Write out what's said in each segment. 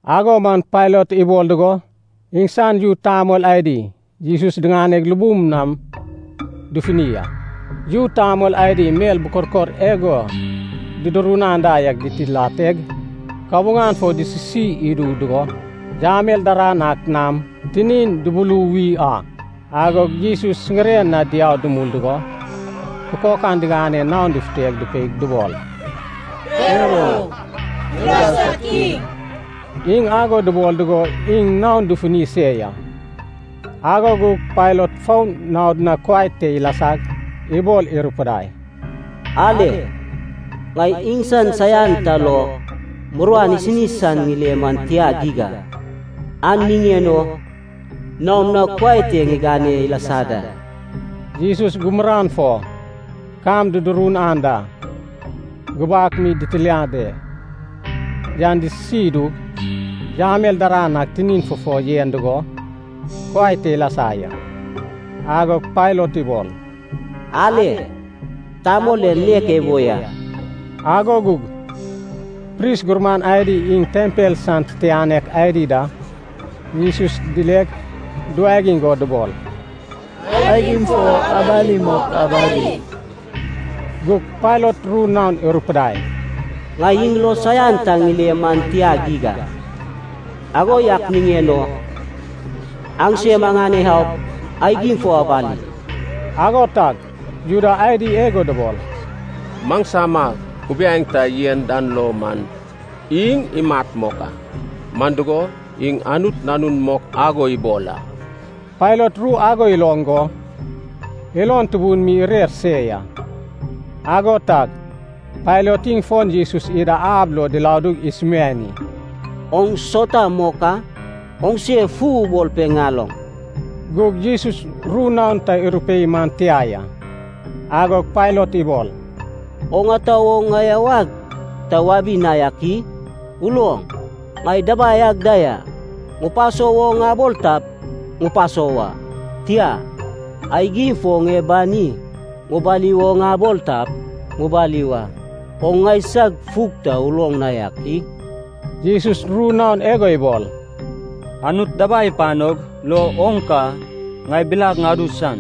Ago man Pailat ibol dugo, iŋsan yu tamol adi Jesus diŋaneg lubum nam dufuni a. Yu tamol adi mel bukorkor igo dudurun anda yak ditiladeg, kabuŋan fo disisi idu dugo, yamel daran ak nam tinin dubuluwi a. Agog Jesus siŋiren na diau dumul dugo, kukokan diganeg naon dufuteg dupeig dubol, “Per o, Juda sad kiŋ!” Iŋ ago dubol dugo iŋ naon dufuni se ya. Ago gug Pailat fon naod na kuai te ilasag, ibol irupudai, “Ale, ŋai iŋsan saian ta lo muruan isini san ŋile man tia geig a. An niŋen o naom na kuai te ŋigane ilasa da.” Jesus gumuran fo kam dudurun anda gubak mi ditilade yan disisi idug, yamel daran ak tinin fufo yen dugo, kuai te ilasa ya. Agog Pailat ibol, “Ale, tamol en nek ebo ya!” Ago gug pris gurman adi iŋ tempel san titianek adi da Jesus dileg duwagiŋ go dubol, “Aigim fo abali mok abali!” Gug Pailat ru naon irupidai, “Ŋai iŋ lo saian ta ŋile man tia geig a. Ago yak niŋen o aŋsem aŋane aup, aigim fo abali.” Ago tag Juda adi igo dubol, “Maŋsama kubiaeŋ ta yen dan lo man, iŋ imat mok a. Man dugo, iŋ Anut Nanun mok ago ibol a.” Pailat ru ago iloŋ go, ilon tubun mi irer se ya. Ago tag Pailat iŋ fon Jesus ida ab lo diladug isumiani, “Oŋ sauta mok a? Oŋse fu ubol pe ŋaloŋ.” Gug Jesus ru naon ta irupei man tia ya. Agog Pailat ibol, “Oŋ ata wo ŋai awag ta wabi na dak i? Uloŋ, ŋai dabai ag da ya. Ŋupaso wo ŋabol tap, ŋupaso wa. Tia, aigim fo ŋie bani ŋubali wo ŋabol tap, ŋubali wa. Oŋ ŋaisag fug ta uloŋ na yak i?” Jesus ru naon igo ibol, “Anut dabai ipanog lo oŋ ka ŋai bilag ŋadu san.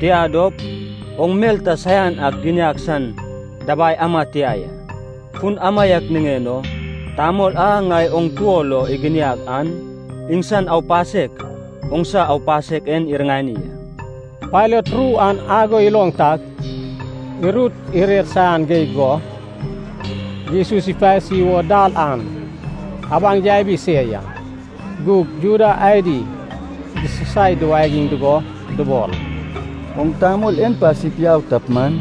Tia dop, oŋ mel ta saian ak giniag san dabai ama tia ya. Fun amaiak niŋen o, tamol a ŋai oŋ tuo lo iginiag an, iŋsan aupasek oŋsa aupasek en iriŋani a.” Pailat ru an ago iloŋ tag, irut irer saian geig go, Jesus ipasi wo dal an abaŋ yabi se ya. Gug Juda adi disasai duwagiŋ dugo dubol, “Oŋ tamol en pasip yau tap man,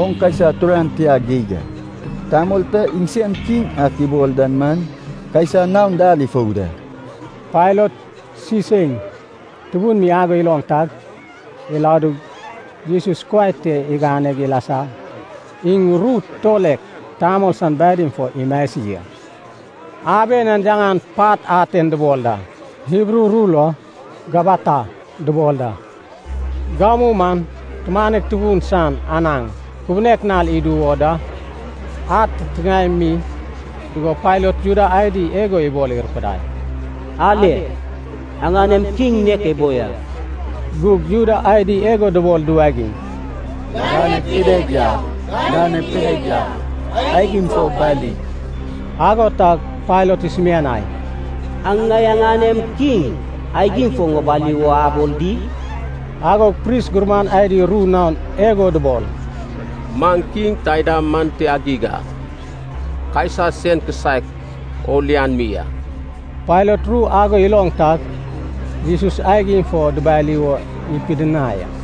oŋ Kaisa turan tia geig a. Tamol ta iŋsen kiŋ ak ibol dan man, Kaisa naon dal ifou da.” Pailat siseiŋ tubun mi ago iloŋ tag, iladug, Jesus kuai te iganeg ilasa. Iŋ ru tulek tamol san badim fo imasi a. Aben an yaŋan Pat Aten dubol da, Hibru ru lo Gabata dubol da. Gamu man tumanek tubun san anaŋ kubunek nal idu wo da. Ad titiŋaem mi dugo Pailat Juda adi igo ibol irupidai, “Ale, aŋanem kiŋ nek ebo ya!” Gug Juda adi igo dubol duwagiŋ, “Ganep ideg yau! Ganep ideg yau! Aigim fo bali!” Ago tag Pailat isumianai, “Aŋ ŋai aŋanem kiŋ aigim fo ŋibali wo abol di?” Agog pris gurman adi ru naon igo dubol, “Maŋ kiŋ taida man tia geig a. Kaisa sen kisaek o lian mi a!” Pailat ru ago iloŋ tag, Jesus aigim fo dubali wo ipidinai a.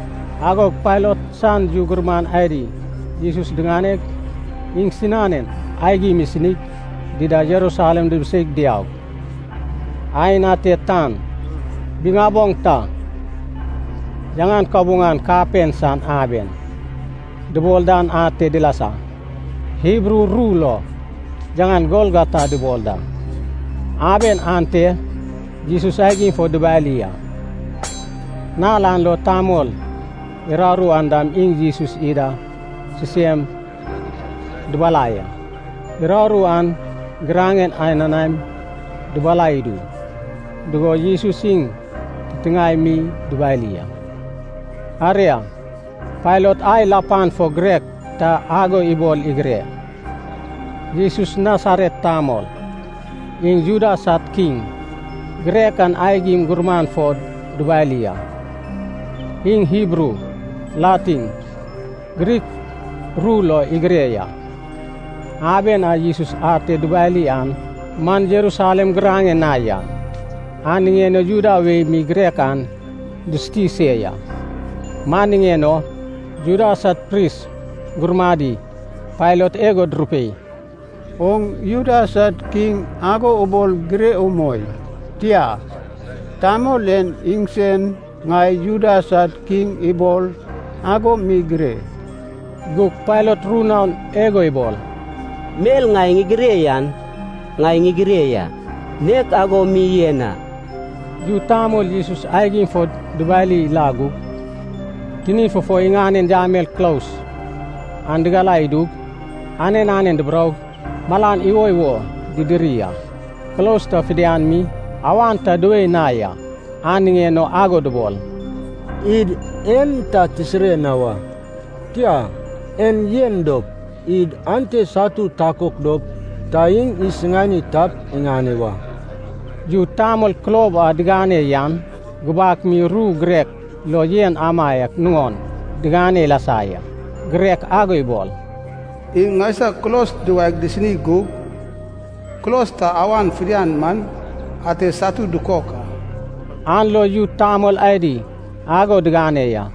Agog Pailat san yu gurman adi Jesus diŋaneg, iŋsinanen aigim isinig, dida Jerusalem dibiseig diaug, aen ate tan biŋaboŋ ta, yaŋan “kabuŋan kapen san aben” dubol dan ate dilasa. Hibru ru lo yaŋan Golgota dubol da. Aben ante Jesus aigim fo dubali a. Nal an lo tamol uraru an dam iŋ Jesus ida sisem dubalai a. Uraru an giraŋen ananaem dubalai idu dugo, Jesus iŋ titiŋae mi dubali a. Aria, Pailat ai lapan fo girek ta ago ibol igire, “Jesus Nasaret tamol, iŋ Juda sad kiŋ.” Girek an aigim gumuran fo dubali a. Iŋ Hibru, Latin, Grik ru lo igire ya. Aben a Jesus ate dubali an man Jerusalem giraŋen na ya, an niŋen o Juda wei mi girek an dusuti se ya. Man niŋen o Juda sad pris gurmadi Pailat igo durupei, “Oŋ Juda sad kiŋ ago ubol gire umoi. Tia, ‘tamol en iŋsen ŋai Juda sad kiŋ ibol’ ago mi gire.” Gug Pailat ru naon igo ibol, “Mel ŋai ŋigire yan ŋai ŋigire ya. Nek ago mi yen a.” Yu tamol Jesus aigim fo dubali la gug, tinin fufo iŋanen yamel kulos an digalai idug, anen anen duburoug malan iwoiwo didiri a. Kulos ta fidian mi, awan ta duwei na ya, an niŋen o ago dubol, “Id en ta tisire na wa. Tia, en yen dop, id ate satu takok dop, ta iŋ isiŋani tap iŋane wa.” Yu tamol kulob a digane yan gubak mi ru girek lo yen amaiak nuŋon digane ilasa ya. Girek ago ibol, “Iŋ ŋaisag kulos duwaeg disini gug, kulos ta awan fidian man ate satu dukok a.” An lo yu tamol adi ago digane ya.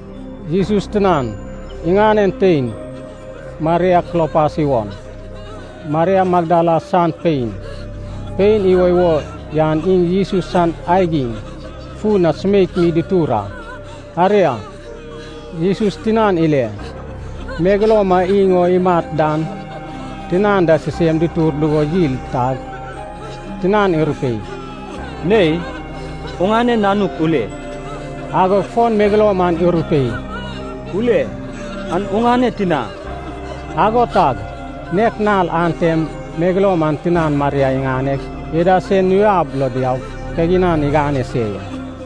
Jesus tinan, iŋanen tein, Maria Klopas iwon, Maria Magdala san pein, pein iwoiwo yan iŋ Jesus san aigim fun na sumeik mi dutur a. Aria, Jesus tinan ile, megeloum a iŋ o imat dan tinan da sisem dutur dugo yil tag, tinan irupei, “Nei, oŋane nanuk ule!” Agog fon megeloum an irupei, “Ule, an oŋane tina.” Ago tag nek nal antem megeloum an tinan Maria iŋaneg ida sen nuab lo diaug, kaginan igane se ya.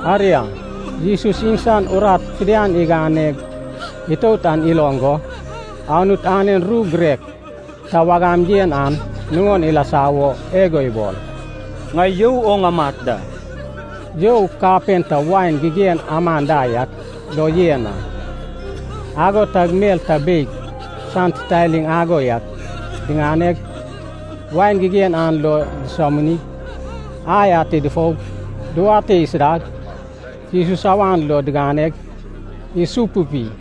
Aria, Jesus iŋsan urat fidian iganeg itout an iloŋ go, Anut anen ru girek ta wagam yen an nuŋon ilasa wo igo ibol, “Ŋai you o ŋamat da.” You kapen ta wain gigen aman da yak lo yen a. Ago tag mel ta beig san titaliŋ ago yak diŋaneg, wain gigen an lo disominig, ai ate dufoug, duwate isidag, Jesus awan lo diganeg, isupupi.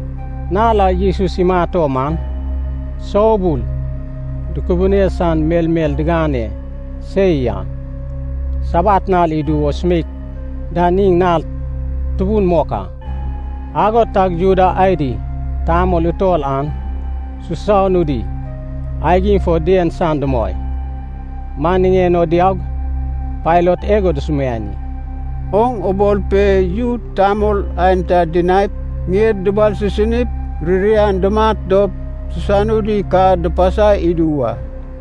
Nal a Jesus imat o man, soubul dukubune san melmel digane se ya. Sabat nal idu wo sumeik dan iŋ nal tubun mok a. Ago tag Juda adi tamol utol an susanudi aigim fo dien san dumoi. Man niŋen o diaug, Pailat igo dusumiani, “Oŋ ubol pe yu tamol aenta dinaip, ŋied dubalsisinip, ririan dumat dop, susanudi ka dupasai idu wa.”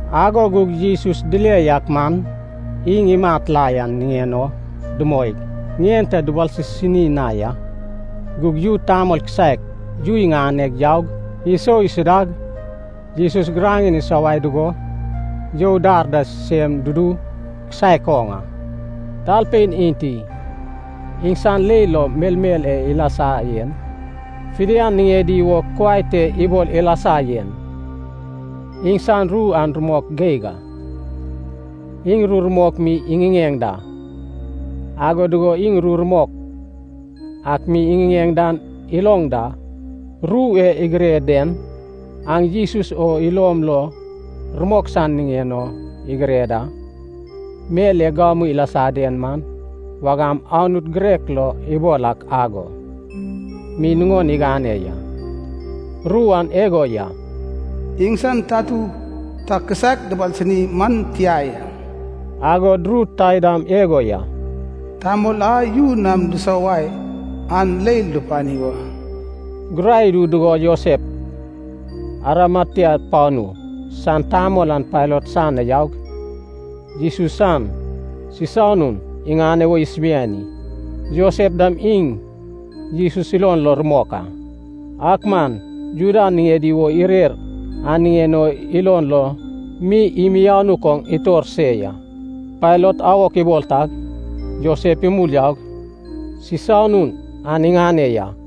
Ago gug Jesus dile yak man, iŋ imat la yan niŋen o dumoig, ŋien ta dubalsisini na ya. Gug yu tamol kisaek yu iŋaneg, yaug, isou isidag, Jesus giraŋen isowae dugo, you dar da sisem dudu kisaek oŋ a. Talpein enti, iŋsan leil lo melmel e ilasa yen fidian niŋedi wo kuai te ibol ilasa yen, iŋsan ru an rumok geig a. Iŋ ru rumok mi iŋiŋeŋ da, ago dugo iŋ ru rumok ak mi iŋiŋeŋ dan iloŋ da. Ru e igire den, aŋ Jesus o ilom lo rumok san niŋen o igire da. Mel e gamu ilasa den man wagam Anut girek lo ibol ak ago mi nuŋon igane ya. Ru an igo ya, “Iŋsan tatu ta kisaek dubalsini man tia ya.” Agod ru taidam igo ya, “Tamol a yu nam disowae an leil dupani wa.” Gurai idu dugo Josef, Arimatea panu san tamol an Pailat san na yaug, Jesus san sisanun iŋane wo isumiani. Josef dam iŋ Jesus ilon lo rumok a. Ak man Juda niŋedi wo irer an niŋen o ilon lo mi imianuk oŋ itor se ya. Pailat awok ibol tag, Josef imul yaug sisanun an iŋane ya.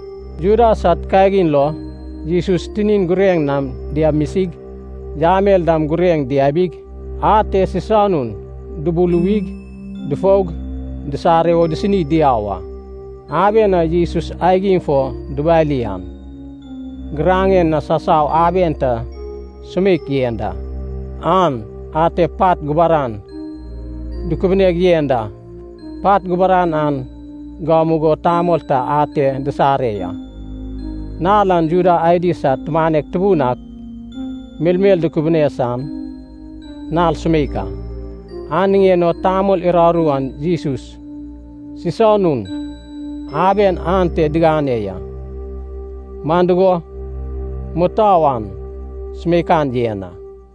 Juda sad kagin lo Jesus tinin gureŋ nam diamisig, yamel dam gureŋ diabig, ate sisanun dubuluwig, dufoug, disare wo disini diau a. Aben a Jesus aigim fo dubali an, giraŋen na sasau aben ta sumeik yen da. An ate pat gubaran dukubuneg yen da, pat gubaran an gamugo tamol ta ate disare ya. Nal an Juda adi sad tumanek tubun ak melmel dukubune san nal sumeik a. An niŋen o tamol uraru an Jesus sisanun aben ante digane ya, man dugo, mutou an sumeikan yen a.